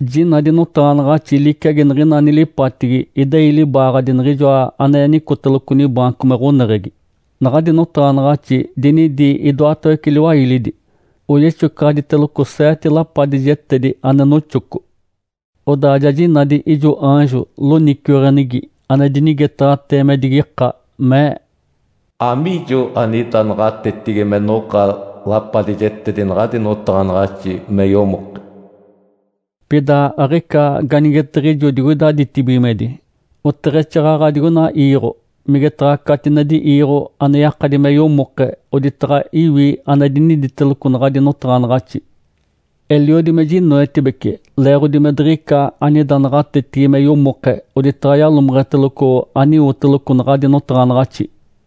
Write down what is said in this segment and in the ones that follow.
Jinadi notaɡ̶anaɡ̶axi liciagi niɡ̶ina nilipatigi idei libaaɡ̶adi Niɡ̶ijoa ane nicoteloco nibaanco me ɡ̶oneɡ̶egi. Naɡ̶adi notaɡ̶anaɡ̶axi dinidi idoatawece liwailidi, oyexocaɡ̶aditeloco seete lapadijetedi ane noxoco. Odaa ja jinadi ijo aanjo loniciweɡ̶enigi ane dinigetaɡ̶atee me digika, mee, “Amiijo anida naɡ̶atetigi me noɡ̶a lapadijetedi naɡ̶adi notaɡ̶anaɡ̶axi me yomoke?” Pida aɡ̶ica ganigetiɡ̶ijo digoida ditibigimedi, oteɡ̶exaaɡ̶aɡ̶a digoina iiɡ̶o, migetaɡ̶a catinedi iiɡ̶o ane yakadi me yomoke oditaɡ̶a iwi ane diniditeloco naɡ̶adi notaɡ̶anaɡ̶axi. Eliodi me jinoetibece leeɡ̶odi me diɡ̶ica anida naɡ̶atetigi me yomoke oditaɡ̶a yalomeɡ̶eteloco aniwoteloco naɡ̶adi notaɡ̶anaɡ̶axi.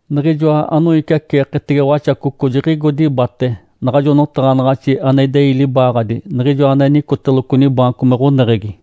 Niɡ̶ijoa anoiciaceeketege Waxacoco jiɡ̶igo dibate naɡ̶ajo notaɡ̶anaɡ̶axi ane idei libaaɡ̶adi Niɡ̶ijoa ane nicoteloco nibaanco me ɡ̶oneɡ̶egi.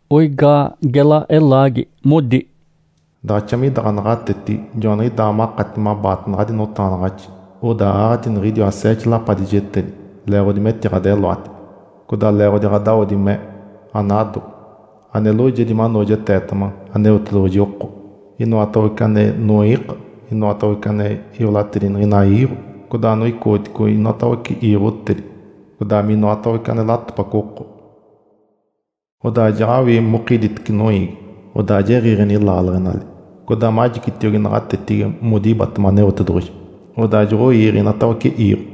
Oigaa gela elaagi, modi, “Daɡ̶axa mida ɡ̶anaɡ̶atetigi, joaniɡ̶idaa makati mabaata naɡ̶adi notaɡ̶anaɡ̶axi, odaa aaɡ̶ati niɡ̶idiwa seete lapadijetedi leeɡ̶odi metiɡ̶adeloati, codaa leeɡ̶odi ɡ̶adawodi me anado, ane loojedi manoojeteetema Aneotedoɡ̶oji oko, inoatawece ane noiika, inoatawece ane iolatedi niɡ̶ina iiɡ̶o, codaa anoicoɡ̶oticogi inoatawece iiɡ̶otedi, codaa minoatawece ane latopaco oko. Odaa jaɡ̶awii mokiditece noiigi, odaa jiɡ̶iiɡ̶eni laaleɡ̶enali, codaa majicitiogi naɡ̶atetigi modibatema Aneotedoɡ̶oji, odaa joɡ̶oiiɡ̶e inatawece iiɡ̶o.”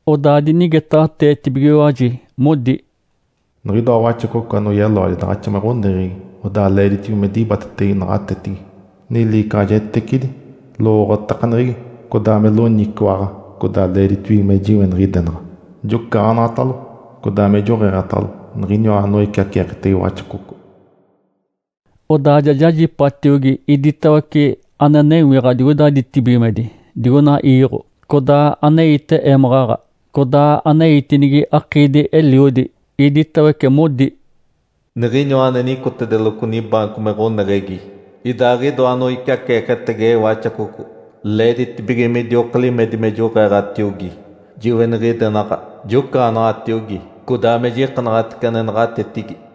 Odaa dinigetaɡ̶ateetibigiwaji modi, “Niɡ̶idoa Waxacoco anoyeloadi daɡ̶axa me ɡ̶oneɡ̶egi, odaa leeditibige me dibatetege naɡ̶atetigi, niliicaɡ̶ajetecidi, lowooɡ̶otakaneɡ̶egi, codaa me loniciwaɡ̶a. Codaa leeditibige me jiweniɡ̶idenaɡ̶a, jocaɡ̶anaɡ̶atalo, codaa me joɡ̶eeɡ̶atalo niɡ̶iniwa anoiciaceeketege Waxacoco.” Odaa ja jajipatiogi iditawece ane newiɡ̶a digoida ditibigimedi, digoina iiɡ̶o, codaa aneite émaɡ̶aɡ̶a, codaa aneitinigi akiidi-eliodi. Iditawece modi, “Niɡ̶iniwa ane nicoteloco nibaanco me ɡ̶oneɡ̶egi, idaaɡ̶idoa anoiciaceeketege Waxacoco, leeditibige midioka limedi me joɡ̶eeɡ̶atiogi, jiweniɡ̶idenaɡ̶a, jocaɡ̶anaɡ̶atiogi, codaa me jikanaɡ̶atece ane naɡ̶atetigi.”